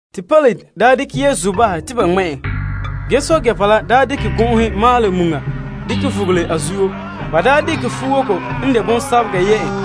Te Pilate daa dekɛ Yesu bahɛ te ba ŋmɛ' en. Ge guruba la dekɛ gɔn'ɔhe maalɛ muŋa dekɛ vugele a zuo. Ba dekɛ fuwoko n de mɔlɔgɔ yɛ' en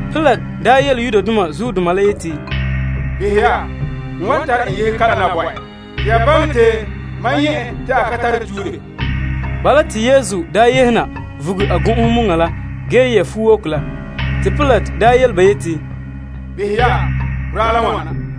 Pilate nya yele Yudoma la yeti, Behɛ ya, n wan tare en yehe kalam na bo ya. Te ya baŋɛ te mam nyɛ' en te a ka tare tuure. Bala, te Yesu yehe na vuga a gɔn'ɔhe muŋa la ge yɛ' fuwoko la. Te Pilate yele ba yeti, Behɛ ya, boraa la n wana.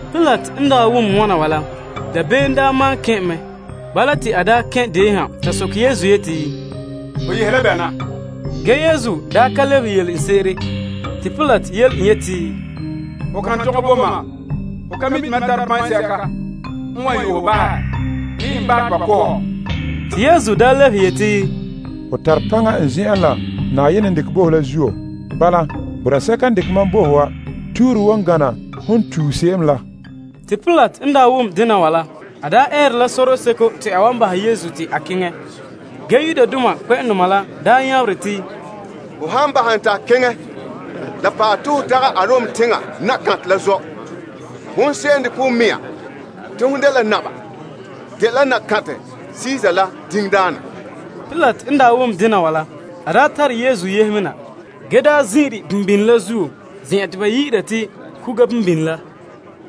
Pilate n daa wom wana wa la, dabeem maan kɛn' en mɛ. Bala, te a kɛn' deon ha ta soke Yesu yeti, Ho yehe la bɛ na? Ge, Yesu ka lebehe yele en sese'ere. Te Pilate yele en yeti, Ho kan tɔgɛ bo mam? Ho ka mi' te mam tare paŋsɛka n wan yo'ɛ hɔ bahɛ, bii n bahɛ te ba ko' hɔ? Te Yesu lebehe yeti, Ho tare paŋa n zen'en la Na'ayenɛ n dekɛ bo ho la zuo. Bala, boraa sɛka n dekɛ mam bo ho wa tuure wan gana hon tue se'em la. Te Pilate n daa wom dena wa la, a eere la sorɔseko te a wan bahɛ Yesu te a keŋɛ. Ge, Yudoma la nyabere te, Ho han bahɛ en te a keŋɛ la pa'alɛ te ho dagɛ Kaesar la zɔ'. Hon se'em n dekɛ ho mea te hon dela naba, dela Kaesar la diŋdaana. Pilate n wom dena wa la, a tare Yesu yehe me na, ge zin'ire la a gankere zen'en la, te ba yi'ira te, Kuga Bimbine La.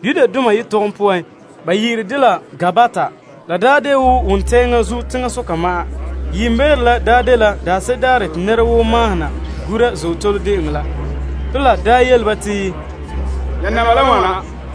Aramaik yetɔgɔm poan, ba yi'ire de te, Gabbata. La de wo wontɛŋa zuo teŋasoka ma'an. Yiimbeere la dela daanse'ere daarɛ te nɛra woo mahona gura Azootole De'eŋɔ La. Pilate yele ba te, Ya naba la n wana.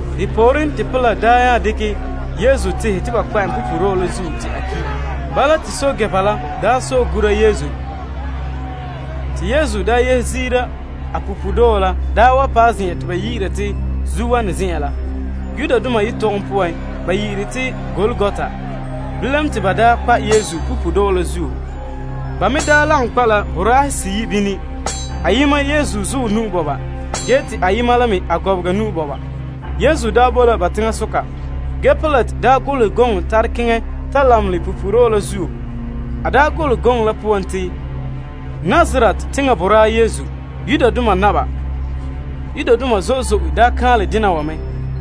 Depooren te Pilate nya dekɛ Yesu tehɛ te ba kpa' en punpuuredɔɔ la zuo te a ki'. Te ba nya to'e Yesu. Te Yesu daa yehe ziira a punpuuredɔɔ la wa paɛ zen'en te ba yi'ira te, Zuowanɛ Zen'an La. Aramaik yetɔgɔm poan, ba yi'ire te, Golgota. Bilam, te ba kpa' Yesu punpuuredɔɔ la zuo. Ba me lagom kpa' la boraahe seyi' bini, ayema Yesu zuɔ nu'o, ge te ayema la me a gɔbega nu'o. Yesu bo la ba teŋasoka. Ge Pilate golehɛ gɔŋɔ tare keŋɛ ta lamenɛ punpuuredɔɔ la zuo. A daa golehɛ gɔŋɔ la poan te, Nazaret teŋa boraa Yesu, Yudoma naba. Yudoma zo'e zo'e kaanlɛ dena wa mɛ.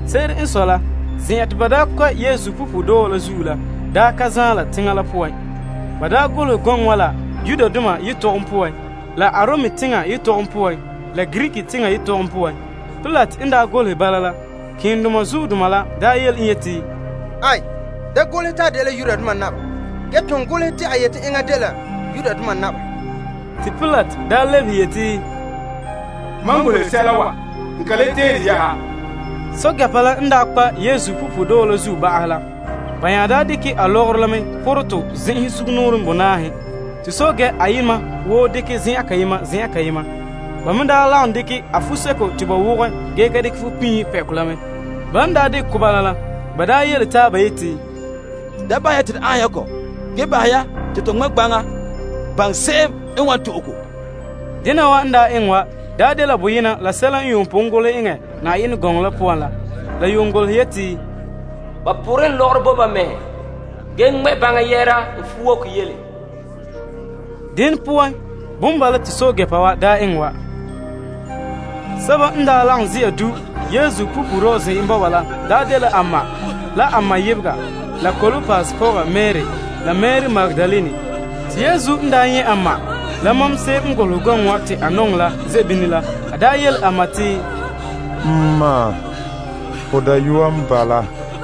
Se'ere n sɔe la, zen'an te ba daa kpa' Yesu punpuuredɔɔ la zuo la ka zaan la teŋa la poan. Ba golehɛ golehegɔ wa la Aramaik yetɔgɔm poan la Latin yetɔgɔm poan la Greek yetɔgɔm poan. Pilate n golehɛ bala la, malema keendoma la yele en yeti, Da golehɛ te, Yudoma naba. Ge ton golehɛ te, a yeti enŋa dela Yudoma naba. Te Pilate daa lebehe yeti, Mam golehɛ sɛla wa, n ka le tee de yɛ'ɛha. Pɛɛntɛɛnreba la n daa ta kpa' Yesu punpuuredɔɔ la zuo ba'ahɛ la, ba nya dekɛ la a lɔgɔrɔ la pɔrɛ tɔ zen'enhen sugumnɔɔren bonaahe. Te pɛɛntɛɛnreba ayema woo dekɛ zen'an kayema, zen'an kayema. Ba me lagom dekɛ a fuo seko te ba wɔgɛ ko munɛ la. Ban dekɛ kɔ bala la, ba yele taaba yeti, Da bahɛ ya te to aanhom ya kɔ. Ge, bahɛ ya te to ŋmɛ' ya gbaŋa, gbaŋa se'em n wan to'e ko. Dena wa n eŋɛ wa dela boyena la sɛla n yuun pon golehɛ eŋɛ Yenɛ gɔŋɔ la poan la. La yuun golehɛ yeti, Ba toorɛ la mam lɔgɔrɔ bo taaba, ge ŋmɛ' gbaŋa mam lɔgɔyɛɛtɔ zuo. Dene poan, bala mea n bala te pɛɛntɛɛnreba wa daa eŋɛ wa. Sɛba n daa lagom ze'a du' Yesu punpuuredɔɔ zen'an bɔba la dela a ma, la a ma yebega, la Klopas pɔga Mari, la Mari Magdalene. Te Yesu n nyɛ' a ma, la mam se'em n golehɛ gɔŋɔ wa te a nɔŋɛ ze' bini la, a yele a ma te, N ma, ho dayɔa n bala.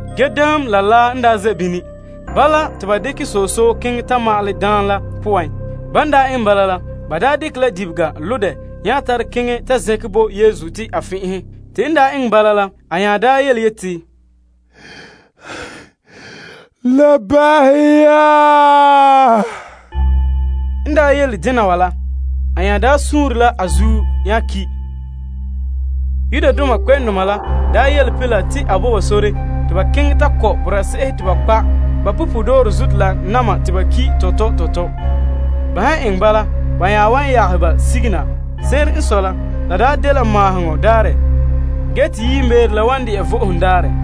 Ge daam la laa n ze' bini. Bala, te ba dekɛ soso keŋɛ ta ma'alɛ daam la poan. Ban eŋɛ bala la, ba dekɛ la dibega lo' dɛ nya tare keŋɛ ta zɛnkɛ bo Yesu. N to'e daam la, ge nya yeti, La ba'ahɛ ya. N yele dena wa la, a nya daa sure la a zuo nya ki'. Yudoma la daa yele Pilate te a bo ba sore te ba kɔ' boraa se'ehe te ba kpa' ba punpuuredɔɔrɔ zuto la na'ma te ba ki' tɔtɔ tɔtɔ. Ban han eŋɛ bala, ba nya wan yagehɛ ba sige na. Se'ere n sɔe la, la daa dela Maaheŋɔ Daarɛ ge te yiimbeere la wan de'a toolom Vo'ohogo Daarɛ.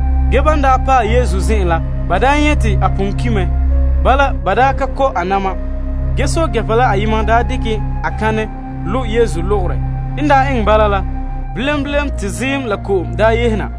Ge, ban paɛ Yesu zen'en la, ba nyɛ' te a pon ki' mɛ. Bala, ba ka kɔ' a na'ma. Ge pɛɛntɛɛnreba la ayema dekɛ a kanɛ lo' Yesu logorɛ. N eŋɛ bala la, bilam bilam te ziim la ko'om daa yehe na.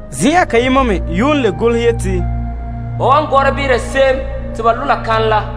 Zen'an kayema me yuun le golehɛ yeti, Ba wan gɔra behera se'em te ba lo' la kanɛ la.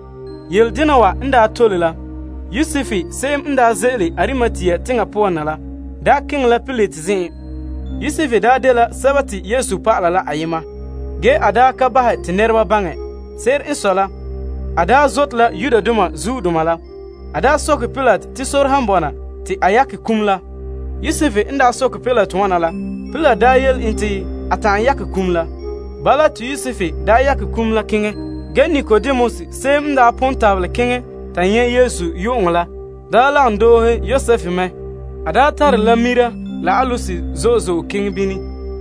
Yeledena wa n daa tole la, Yosef se'em n ze'ele Arimatea teŋa poan na la, keŋɛ la Pilate zen'en. Yosef dela Yesu dɔlɔba la ayema. Ge a ka bahɛ te nɛreba baŋɛ. Se'ere n sɔe la, a zote la Yudoma zuodoma la. A soke Pilate te sore han bɔna bo en te a yakɛ kum la. Pilate wana la, Pilate yele en te a ta'an yakɛ kum la. Yosef keŋɛ ta yakɛ kum la. Ge Nikodemus, se'em n pon tabelɛ keŋɛ ta nyɛ' Yesu yu'uŋɔ la lagom doohe Yosef mɛ. A tare la muur la aloes zo'e zo'e keŋɛ bini.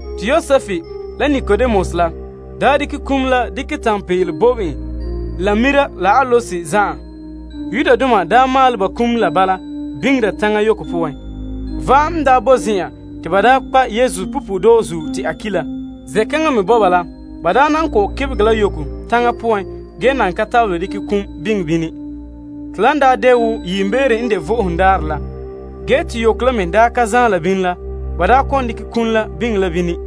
Te Yosef la Nikodemus la dekɛ kum la dekɛ tanpeele pɔnbɛ en la tiihe biila. Yudoma daa maalɛ ba kum la bala biŋera taŋa yoko poan. Va'am n daa bo zen'an te ba kpa' Yesu punpuuredɔɔ zuo te a ki' la. Zen'kaŋa me bɔba la, nɛra daa nan kɔ'ɔn kebegɛ la yoko taŋa poan ge nan ka tabelɛ dekɛ kum biŋe bini. Te yiimbeere n wan dɛna Vo'ohogo Daarɛ la zuo, ge te yoko la me ka zaan la bini la, ba daa kɔ'ɔn dekɛ kum la biŋe la bini.